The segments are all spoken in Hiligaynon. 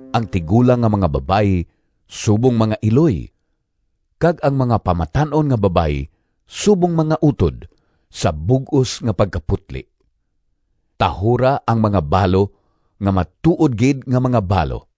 ang tigulang nga mga babayi subong mga iloy, kag ang mga pamatan-on nga babayi subong mga utod, sa bug-os nga pagkaputli. Tahura ang mga balo nga matuod gid nga mga balo.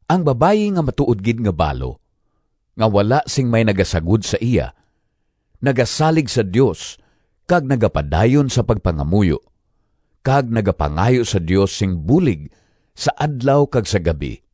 Ang babayi nga matuod gid nga balo, nga wala sing may nagasagod sa iya, nagasalig sa Dios kag nagapadayon sa pagpangamuyo, kag nagapangayo sa Dios sing bulig sa adlaw kag sa gab-i.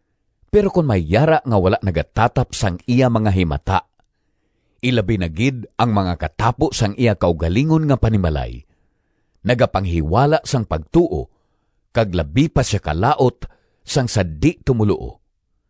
Pero kon may yara nga wala nagatatap sang iya mga himata, ilabi na gid ang mga katapo sang iya kaugalingon nga panimalay, nagapanghiwala sang pagtuo kag labi pa sia kalaut sang sa di-tumoluo.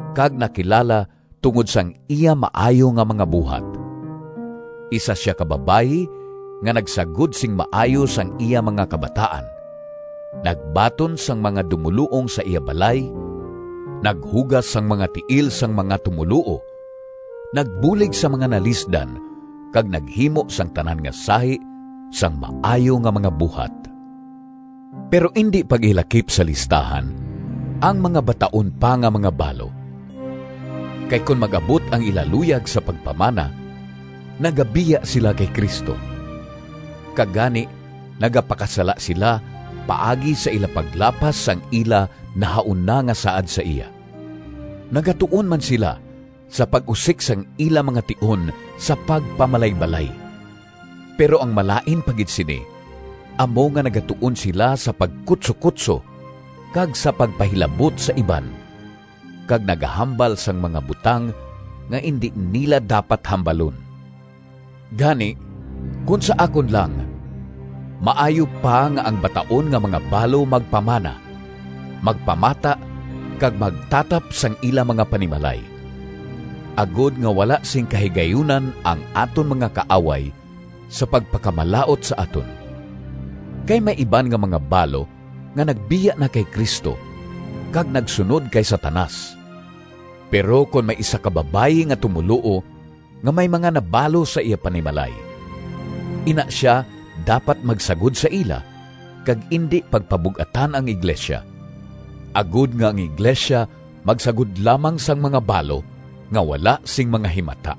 kag nakilala tungod sang iya maayo nga mga buhat: isa sia ka babayi nga nagsagod sing maayo sang iya mga kabataan, nagbaton sang mga dumoluong sa iya balay, naghugas sang mga tiil sang mga tumoluo, nagbulig sa mga nalisdan kag naghimo sang tanan nga sahi sang maayo nga mga buhat. Pero indi pag-ilakip sa listahan ang mga bataon pa nga mga balo, kay kon mag-abot ang ila luyag sa pagpamana, nagabiya sila kay Cristo, kag gani nagapakasala sila paagi sa ila paglapas sang ila nahauna nga saad sa iya. Nagatuon man sila sa pag-usik sang ila mga tion sa pagpamalaybalay, pero ang malain pa gid sini amo nga nagatuon sila sa pagkutsokutso kag sa pagpahilabot sa iban, kag nagahambal sang mga butang nga indi nila dapat hambalon. Gani, kon sa akon lang maayo pa nga ang bataon nga mga balo magpamana, magpamata, kag magtatap sang ila mga panimalay, agod nga wala sing kahigayunan ang aton mga kaaway sa pagpakamalaut sa aton. Kay may iban nga mga balo nga nagbiya na kay Cristo kag nagsunod kay Satanas. Pero kon may isa ka babayi nga tumoluo nga may mga nabalo sa iya panimalay, ina sia dapat magsagod sa ila kag indi pagpabug-atan ang iglesia, agod nga ang iglesia magsagod lamang sang mga balo nga wala sing mga himata.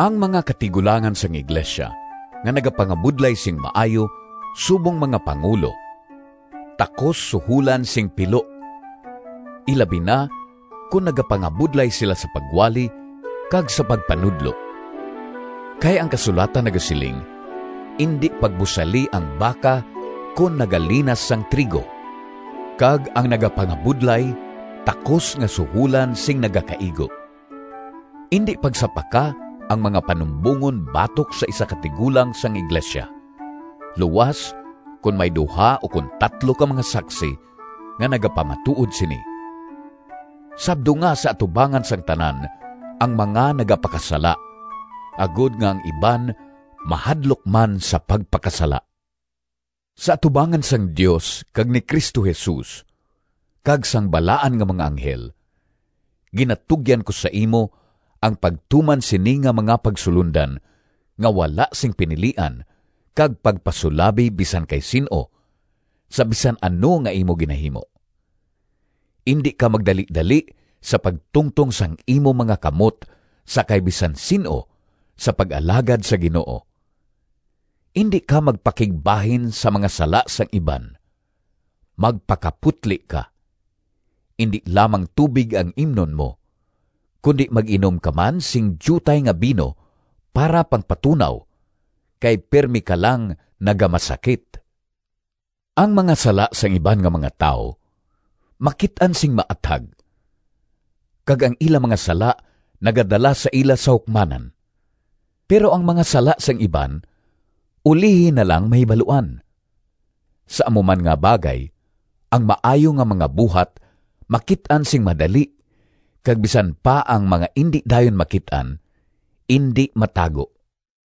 Ang mga katigulangan sang iglesia nga nagapangabudlay sing maayo subong mga pangulo takos suholan sing pilo, ilabi na kon nagapangabudlay sila sa pagwali kag sa pagpanudlo. Kay ang kasulatan nagasiling, “Indi pagbusali ang baka kon nagalinas sang trigo,” kag “Ang nagapangabudlay takos nga suholan sing nagakaigo.” Indi pagsapaka ang mga panumbongon batok sa isa ka tigulang sang iglesia, luas kon may duha ukon tatlo ka mga saksi nga nagapamatuod sini. Sabdunga sa atubangan sang tanan ang mga nagapakasala, agod nga ang iban mahadlok man sa pagpakasala. Sa atubangan sang Dios kag ni Cristo Jesus kag sang balaan nga mga anghel, ginatugyan ko sa imo ang pagtuman sini nga mga pagsulondan nga wala sing pinilian kag pagpasulabi bisan kay sin-o sa bisan ano nga imo ginahimo. Indi ka magdalidali sa pagtungtong sang imo mga kamot sa kay bisan sin-o sa pag-alagad sa Ginoo. Indi ka magpakigbahin sa mga sala sang iban. Magpakaputli ka. Indi lamang tubig ang imnon mo, kundi mag-inom ka man sing diutay nga bino para pangpatunaw, kay pirme ka lang nagamasakit. Ang mga sala sang iban nga mga tawo makit-an sing maathag, kag ang ila mga sala nagadala sa ila sa hukmanan. Pero ang mga sala sang iban ulihi na lang mahibaluan. Sa amo man nga bagay ang maayo nga mga buhat makit-an sing madali kag bisan pa ang mga indi dayon makit-an, indi matago.